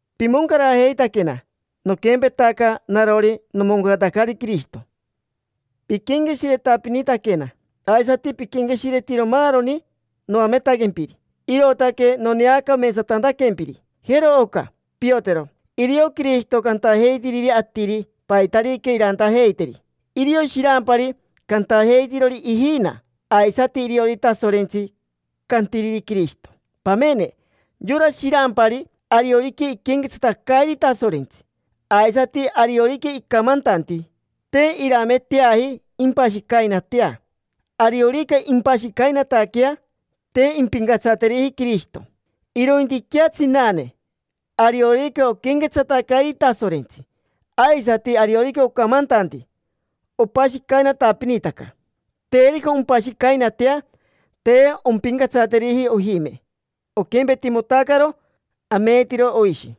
Pimoncarajeitaquena, noquempetaca narori nomoncaratacari Quirishito. Piquenqueshiretapinitaquena, aisati piquenqueshiretiro maaroni noametaquempiri, irootaque noneacameetsatantaquempiri. Jero oca, piotero: irio Quirishito cantajeitiriri atiri paitarica irantajeiteri; irio shirampari cantajeitirori ijina; aisati irio Tasorentsi cantiriri Quirishito. Pamene yora shirampari, ariorica iquenquetsatacairi Tasorentsi, aisati ariorica icamantanti, te irameteaji impashicainatea. Ariorica impashicainataquea, te impincatsateriji Quirishito. Irointiquea tsinane, ariorica oquenquetsatacairi Tasorentsi, aisati ariorica ocamantanti, opashicainatapinitaca. Terica ompashicainatea, te ompincatsateriji ojime: oquempetimotacaro ameetiro oishi.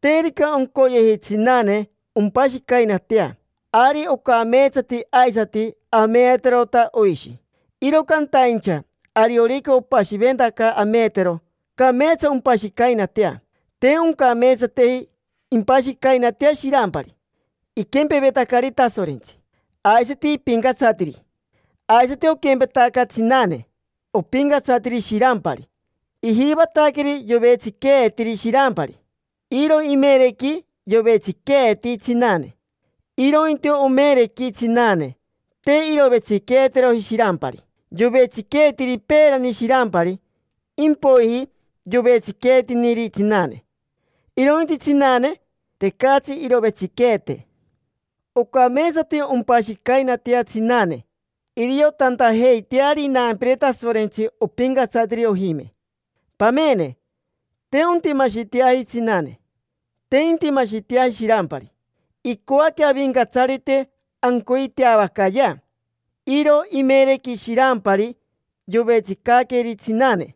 Terica oncoyeji tsinane ompashicainatea, ari ocameetsati aisati ameeterota oishi. Iro cantaincha ariorica opashiventaca ameetero, cameetsa ompashicainatea. Te oncameetsateji impashicainatea shirampari: iquempevetacari Tasorentsi, aisati ipincatsatiri. Aisati oquempetaca tsinane, opincatsatiri shirampari. Ijivataqueri yovetsiqueetiri shirampari. Iro imerequi yovetsiqueeti tsinane; irointi omerequi tsinane, te irovetsiqueeteroji shirampari. Yovetsiqueetiri peerani shirampari, impoiji yovetsiqueetiniri tsinane. Irointi tsinane, tecatsi irovetsiqueetene. Ocameetsati ompashicainatea tsinane iriotantajeiteari inampire Tasorentsi opincatsatiri ojime. Pamene, te ontimashiteaji tsinane, te intimashiteaji shirampari. Icoaque Avincatsarite ancoiteavacayea. Iro imerequi shirampari yovetsicaqueri tsinane,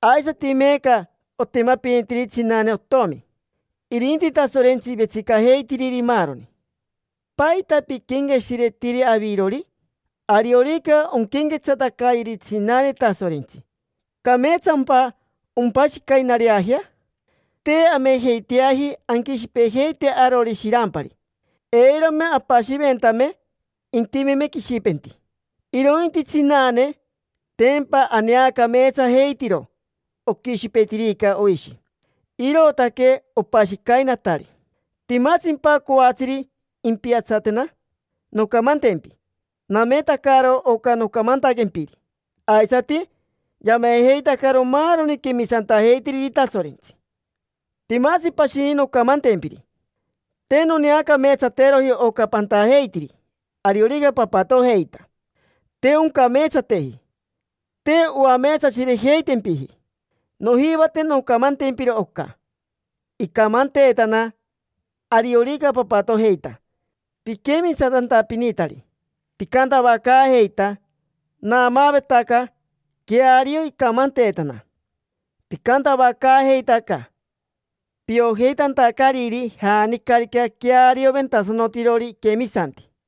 aisati meeca otimapinitiri tsinane otomi. Irinti Tasorentsi vetsicajeitiriri maaroni. ¿Paita piquenqueshiretiri avirori? Ariorica onquenquetsatacayeri tsinane Tasorentsi, ¿cameetsampa ompashicainareajea? Te amejeiteaji anquishipejeite arori shirampari. Eirome apashiventame intimeme quishipenti. Irointi tsinane, tempa aneacameetsajeitiro oquishipetirica oishi: irootaque opashicainatari. ¿Timatsimpa coatsiri impiatsatena? Noncamantempi: nametacaro oca nocamantaquempiri, aisati yamejeitacaro maaroni quemisantajeitiriri Tasorentsi. Timatsi pashini noncamantempiri. Te noneacameetsateroji oca pantajeitiri ariorica papatojeita: te oncameetsateji, te oameetsashirejeitempiji. Nojivate noncamantempiro oca. Icamanteetana ariorica papatojeita piquemisantantapinitari, picantavacaajeita. Naamaavetaca queario icamanteetana. Picantavacaajeitaca piojeitantacariri janicarica quearioventasanotirori iquemisanti.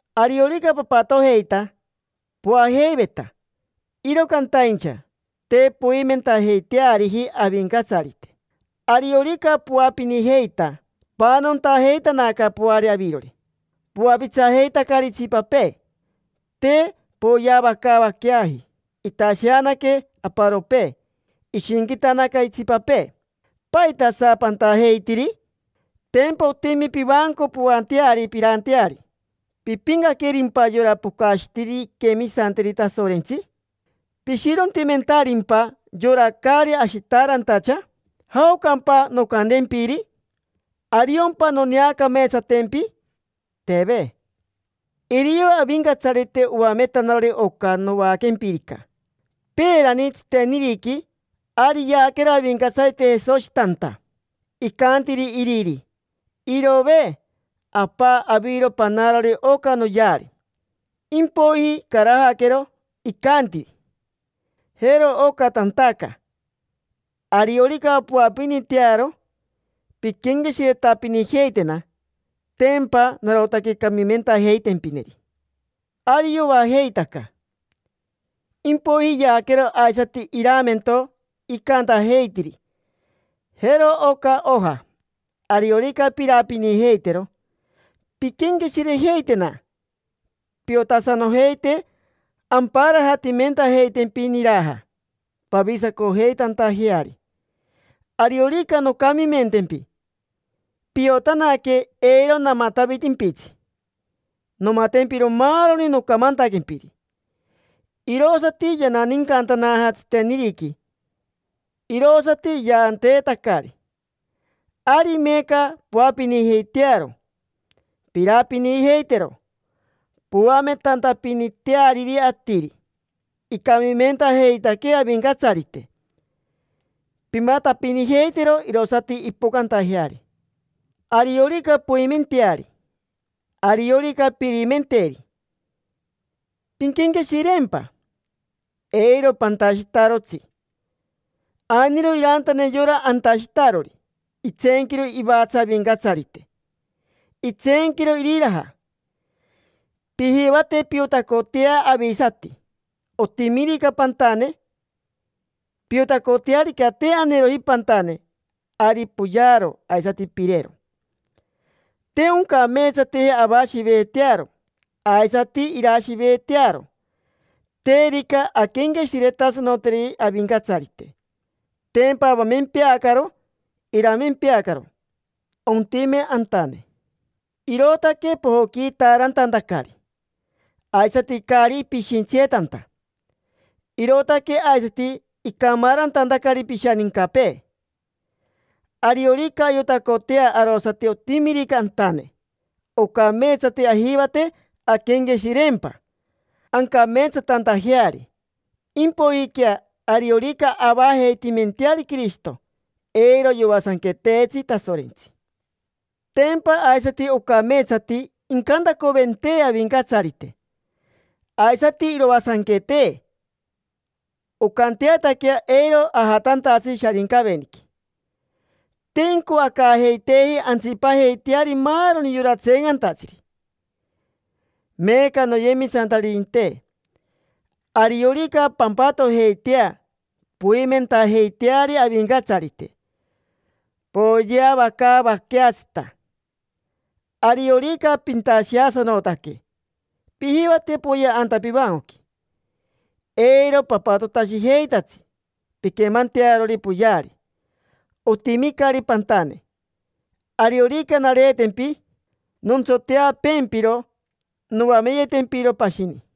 Ariorica papatojeita, poajeiveta, iro cantaincha te poimentajeiteariji Avincatsarite. Ariorica poapinijeita, paanontajeitanaca poari avirori, poapitsajeitacari itsipapee. Te poyeavacaavaqueaji. Itasheanaque aparopee, ishinquitanaca itsipapee. ¿Paitasa pantajeitiri? Tempa otimi pivanco poanteari, piranteari. ¿Pipincaquerimpa yora pocashitiriri inquemisanteri Tasorentsi? ¿Pishirontimentarimpa yora caari ashitaarantacha? ¿Jaocampa noncantempiri? ¿Ariompa noneacameetsatempi? Teve. Irio Avincatsarite oametanarori oca novaaquempirica. Peerani, tsiteniriqui, ari yaaquero Avincatsarite Jesoshi tanta. Icantiri Iriri: “Irove, Apa, aviro panarori oca noyeari”, impoiji icarajaquero. Icanti: “Jero oca tantaca: ariorica poapinitearo, pinquenqueshiretapinijeitena. Tempa narotaque camimentajeitempineri”. Ari yoajeitaca. Impoiji yaaquero aisati iramento. Icantajeitiri: “Jero oca oja, ariorica pirapinijeitero, pinquenqueshirejeitena, piotasanojeite amparajatimentajeitempi niraja pavisacojeitantajeari. Ariorica noncamimentempi, piotanaque eiro namatavitimpitsi, nomatempiro maaroni nocamantaquempiri”. Irosati yananincantanaja tsiteniriqui, irosati yaanteetacari. Ari meeca poapinijeitearo, pirapinijeitero, poametantapiniteariri atiri icamimentajeitaquee Avincatsarite. Pimatapinijeitero, irosati impocantajeari. Ariorica poimenteari, ariorica pirimenteri, pinquenqueshireempa: eiro pantashitarotsi. Ainiro irantane yora antashitarori: itseenquiro ivatsa Avincatsarite, itseenquiro iriraja. Pijivate piotacotea avisati, otimirica pantane. Piotacotearica te aneeroji pantane, ari poyearo, aisati pirero. Te oncameetsateji avashiveetearo, aisati irashiveetearo. Terica anquenqueshiretasanoteri Avincatsarite, tempa avamempeacaro, iramempeacaro: ontime antane. Irootaque pojoquiitaarantantacari, aisati caari pishintsiyetanta. Irootaque aisati icamaarantantacari pishanincapee. Ariorica ayotacotea arosati otimirica antane, ocameetsati ajivate anquenqueshireempa ancameetsatantajeari; impoijiquea, ariorica avajeitimenteari Quirishito, eiro yoasanqueteetsi Tasorentsi. Tempa aisati ocameetsati incantacoventee Avincatsarite, aisati iroasanquetee, oncanteataquea eiro ajatantatsi Sharincaveniqui. Te incoacaajeiteeji antsipajeiteari maaroni yora tseencantatsiri. Meeca, noyemisantaririnte, ariorica pampatojeitea poimentajeiteari Avincatsarite, poyeavacaavaqueatsita. Ariorica pintasheasanotaque, pijivate poyea anta pivancoqui. Eiro papatotashijeitatsi pinquemantearori poyeari: otimicari pantane. Ariorica nareetempi nontsoteapeempiro, noameyetempiro pashini.